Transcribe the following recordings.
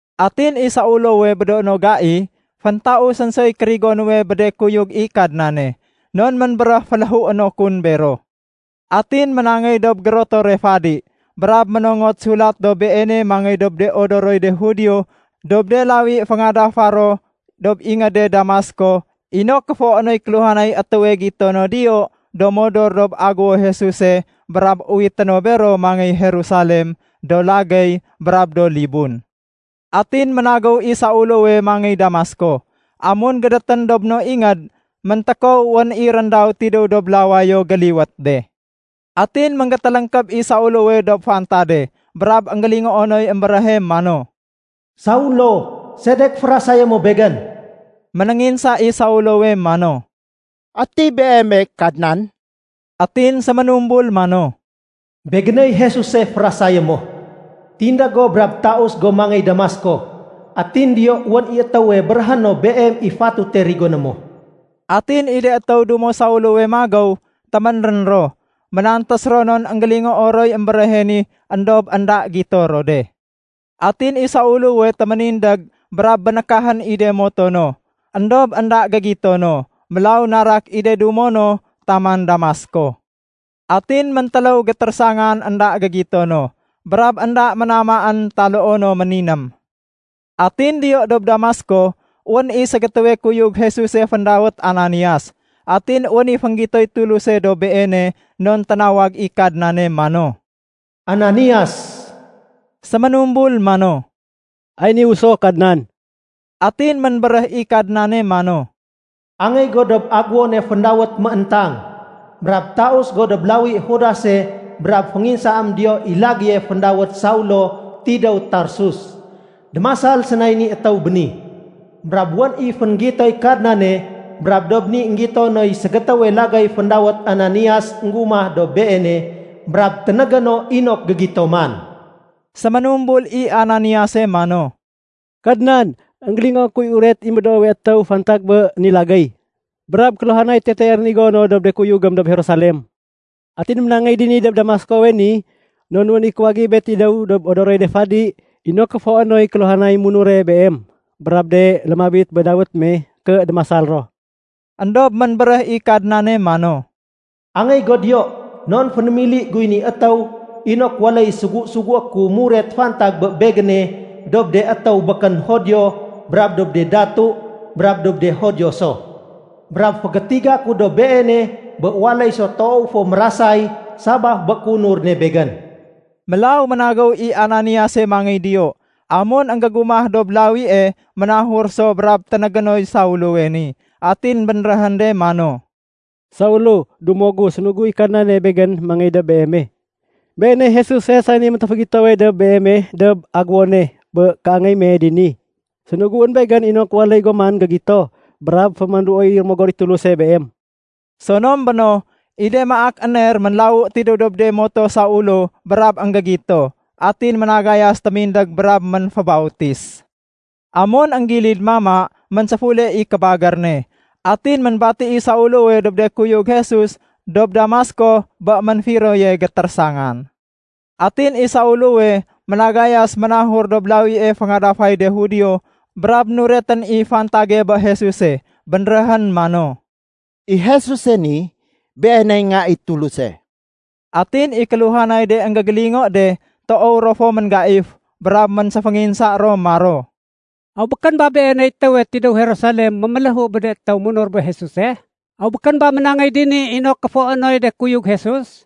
Atin i Saulowe bé do no do gai, féntausén soy kérigo nuwe bé de kuyug i Kadnane. Non ménbéréh féléhué no kun bero. Atin ménangéy dob gérotore fadi, brab ménongot sulat dob beene mangéy dob de odoroy de Judio dob de lawi féngadafa ro dob ingéde Damasko inok kéfoé noy kéluhanay étéwe gito no diyo do modor dob Agéwo Jesuse brab uwité no bero mangéy Jerusalem, do lagéy brab do libun. Atin ménagéw i Saulowe mangéy Damasko. Amun gédétén dob no ingéd, méntékow wén i réndaw tidéw dob lawayo géliwét de. Atin ménggétéléngkéb i Saulowe dob fantade brab énggélingoo noy émbéréhe mano, “Saulo! Sedek férasayé mo Begén?” Ménénginsa i Saulowe mano, “Ati Beeme, Kadnan?” Atin séménumbul mano, “Begéney Jesuse férasayé mo. Tindég go brab taus go mangéy Damasko, atin diyo wén i étéwe béréhé no beem i fatute rigoné mo.” Atin i de étéw dumo Saulowe magéw, téménrén ro. Ménantés ro non énggélingoo roy émbéréhe ni éndob énda gito ro de. Atin i Saulowe téménindég brab bénékahén i de moto no, éndob énda gégito no. Mélaw narak i de dumo no taman Damasko. Atin méntéléw gétérésangan énda gégito no, brab énda ménamaén taloo no méniném. Atin diyo dob Damasko wén i ségétéwe kuyug Jesuse féndawét Ananias. Atin wén i fénggitoy Tuluse dob beene non ténawag i Kadnane mano, “Ananias!” Séménumbul mano, “Ay niwu so Kadnan.” Atin ménbéréh i Kadnane mano, “Angéy go dob agéwone féndawét ‘Mééntang’ brab taus go dob lawi Judase brab fénginsaém diyo i lagéye féndawét Saulo tidéw Tarsus. Démasal sénay ni étéw béni. Brab wén i fénggitoy Kadnane, brab dob ni énggito noy ségétéwe lagéy féndawét Ananias énggumah dob beene brab ténégé no inok gégito man.” Séménumbul i Ananiase mano, “Kadnan, énggélingoo kuy uret i médoowe étéw fantag bé ni lagéy, brab kéluhanay tetee rénigo no dob de kuyugém dob Jerusalem. Atin ménangéy dini dob Damaskowe ni non wén i kuwagibe tidéw dob de odoroy de fadi inok kéfoé noy kéluhanay munure Beem brab de lémabit bé dawét me ké démasal ro.” Endob ménbéréh i Kadnane mano, “Angéy go diyo non fénémili guy ni étéw inok waléy sugu-sugué ku muret fantag bé Begéne dob de étéw békén Judio brab dob de datu brab dob de Judio so. Brab fégétiga ku dob beene bé waléy so toow fo mérasay sabaf bé kéunur ne Begén.” Mélaw ménagéw i Ananiase mangéy diyo. Amun énggégumah dob lawie ménahur so brab ténégé noy Saulowe ni. Atin bénréhén de mano, “Saulo, dumo gu, sénugu i Kadnane begén mangéy dob beeme. Beeney Jesuse sani méntéfégitowe dob beeme dob aguwone bé kéangéy me dini. Sénuguén begén inok waléy go man gégito brab fémanduoy Rémogor i Tuluse beem.” Sonom béno, i de maak éner ménlawu tidéw dob de moto Saulo brab énggégito. Atin ménagayas témindég brab ménfébautis. Amun énggilid mama, ménséfule i kébagér ne. Atin ménbati i Saulowe dob de kuyug Jesus dob Damasko bé ménfiroye gétérésangan. Atin i Saulowe ménagayas ménahur dob de lawi féngadafay de Judio brab nuretén i fantage bé Jesuse. Bénréhén mano, “I Jesuse ni, Beeney Nga i Tuluse.” Atin i kéluhanay de énggégélingo de toow ro fo ménggaif brab ménséfénginsa ro maro, “Aw békén ba beeney étéwe tidéw Jerusalem méméléhu bé de munur bé Jesuse? Aw békén ba ménangéy dini inok kéfoé noy de kuyug Jesus,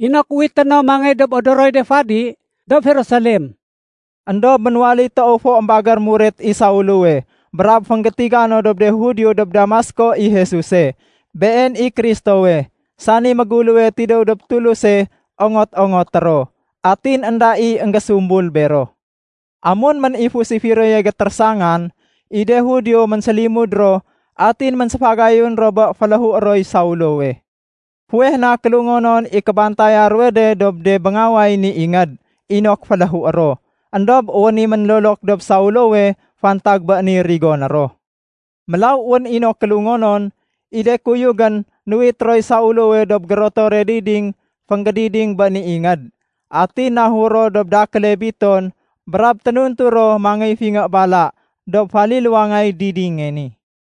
inok uwité no mangéy dob odoroy de fadi dob Jerusalem?” Endob ménwaléy toow fo émbagér muret i Saulowe brab fénggétiga no dob de Judio dob Damasko i Jesuse, Been i Kristowe, sani méguléwe tidéw dob Tuluse ongot-ongoté ro. Atin énda i énggésumbul bero. Amun ménifus i firoye gétérésangan, i de Judio ménsélimud ro atin ménséfagayun ro bé féléhué roy Saulowe. Fuweh na kélungonon i kébantaya ruwe de dob de béngaway ni ingéd inok féléhué ro. Endob wén i ménlolok dob Saulowe fantag bé ni rigoné ro. Mélaw wén i no kélungonon, i de kuyugén nuwit roy Saulowe dob gérotore diding fénggédiding bé ni ingéd. Atin nahur ro dob dakéle biton brab ténuntu ro mangéy fingé bala dob faliluwangay didinge ni.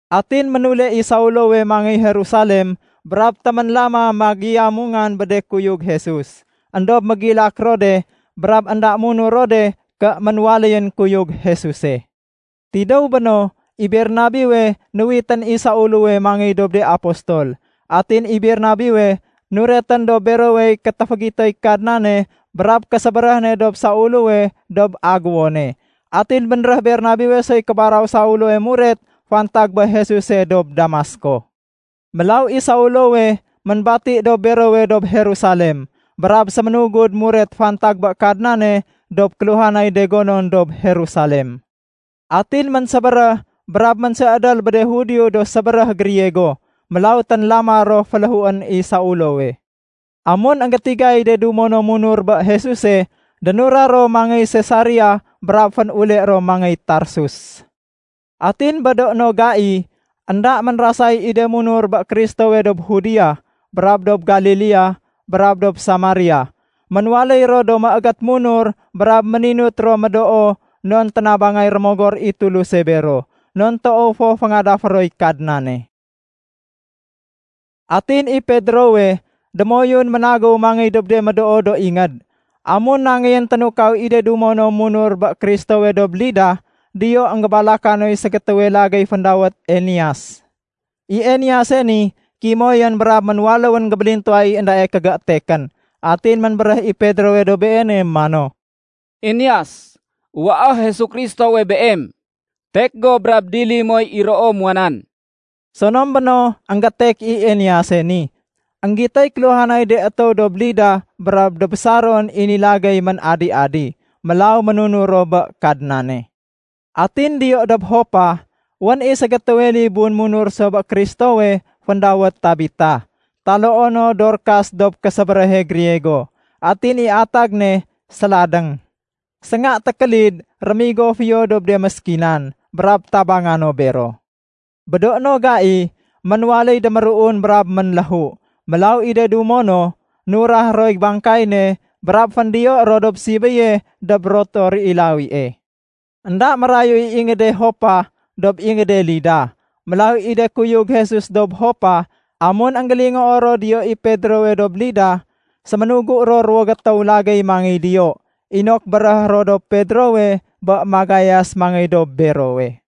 Atin ménule i Saulowe mangéy Jerusalem brab téménlama magiyamongan bé de kuyug Jesus. Endob mégilak ro de brab énda munur ro de ké ménwaléyén kuyug Jesuse. Tidéw béno, i Bernabewe nuwitén i Saulowe mangéy dob de apostol. Atin i Bernabewe nuretén dob berowey kétéfégitoy Kadnane brab késébéréh ne dob Saulowe dob aguwone. Atin bénréh Bernabewe soy kébaraw Saulowe muret fantag bé Jesuse dob Damasko. Mélaw i Saulowe ménbati dob berowe dob Jerusalem. Brab séménugud muret fantag bé Kadnane dob kéluhanay de gonon dob Jerusalem. Atin ménsébéréh brab ménséédél bé de Judio do sébéréh Griego. Mélaw ténlama ro féléhuén i Saulowe. Amun énggétigay de dumo no munur bé Jesuse, dénura ro mangéy Sesaria brab fénule ro mangéy Tarsus. Atin bé do no gai, énda ménrasay i de munur bé Kristowe dob Judea brab dob Galilea brab dob Samaria. Ménwaléy ro do méégét munur brab méninut ro médoo non ténabangay Rémogor i Tuluse bero, non toow fo féngadafé roy Kadnane. Atin i Pedrowe, démoyun ménagéw mangéy dob de médoo do ingéd. Amun nangeyén ténukaw i de dumo no munur bé Kristowe dob Lida, diyo énggébalaka noy ségétéwe lagéy féndawét Eneas. I Enease ni kimoyén brab ménwaléwén gébélintuwa i éndae kégétekén. Atin ménbéréh i Pedrowe dob beene mano, “Eneas, uwaé Jesu Kristowe beem. Tek go brab dili moy iroo muwa nan!” Sonom béno énggétek i Enease ni. Enggitoy kéluhanay de étéw dob Lida brab dob Saron i ni lagéy ménadi-adi. Mélaw ménunur ro bé Kadnane. Atin diyo dob Jopa, wén i ségétéwe libun munur so bé Kristowe féndawét Tabita. (Taloo no Dorkas dob késébéréhe Griego. Atin i atag ne “séladéng”.) Sénga tékélid rémigo fiyo dob de méskinan, brab tabanga no bero. Bé do no gai, ménwaléy déméruun brab ménléhu. Mélaw i de dumo no, nurah roy bangkay ne brab féndiyo ro dob sibéye dob rotor i lawie. Enda mérayu i ingéde Jopa dob ingéde Lida. Mélaw i de kuyug Jesus dob Jopa, amun énggélingoo ro diyo i Pedrowe dob Lida, séménugu ro ruwo gétéw lagéy mangey diyo inok béréhé ro dob Pedrowe bé magayas mangéy dob berowe.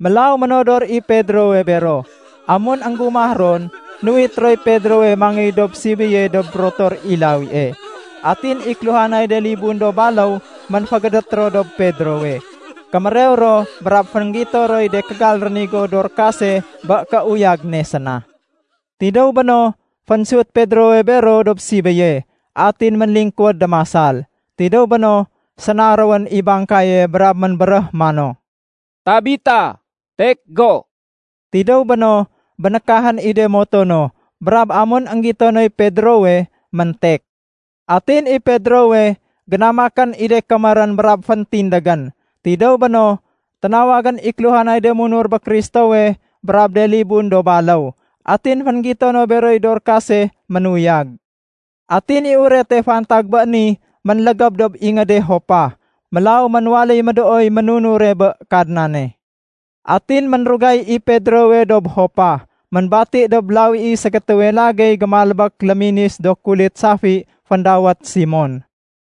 Mélaw ménodor i Pedrowe bero. Amun énggumah ron, nuwit roy Pedrowe mangéy dob sibéye dob rotor i lawie. Atin i kéluhanay de libun do baléw ménfégédét ro dob Pedrowe, kémérew ro brab fénggito roy de kégal rénigo Dorkase bé kéuyag ne séna. Tidéw béno, fénsut Pedrowe bero dob sibéye atin ménlingkuwéd démasal. Tidéw béno, sénaréwén i bangkaye brab ménbéréh mano, “Tabita, tek go!” Tidéw béno, bénékahén i de moto no brab amun énggito noy Pedrowe, méntek. Atin i Pedrowe, génamakén i de kémérén brab féntindégén. Tidéw béno, ténawagén i kéluhanay de munur bé Kristowe brab de libun do baléw, atin fénggito no beroy Dorkase ménuyag. Atin i urete fantag bé ni ménlégéb dob ingéde Jopa. Mélaw ménwaléy médooy ménunure bé Kadnane. Atin ménrugay i Pedrowe dob Jopa. Ménbati dob lawi i ségétéwe lagéy gémalbék léminis do kulit safi féndawét Simon.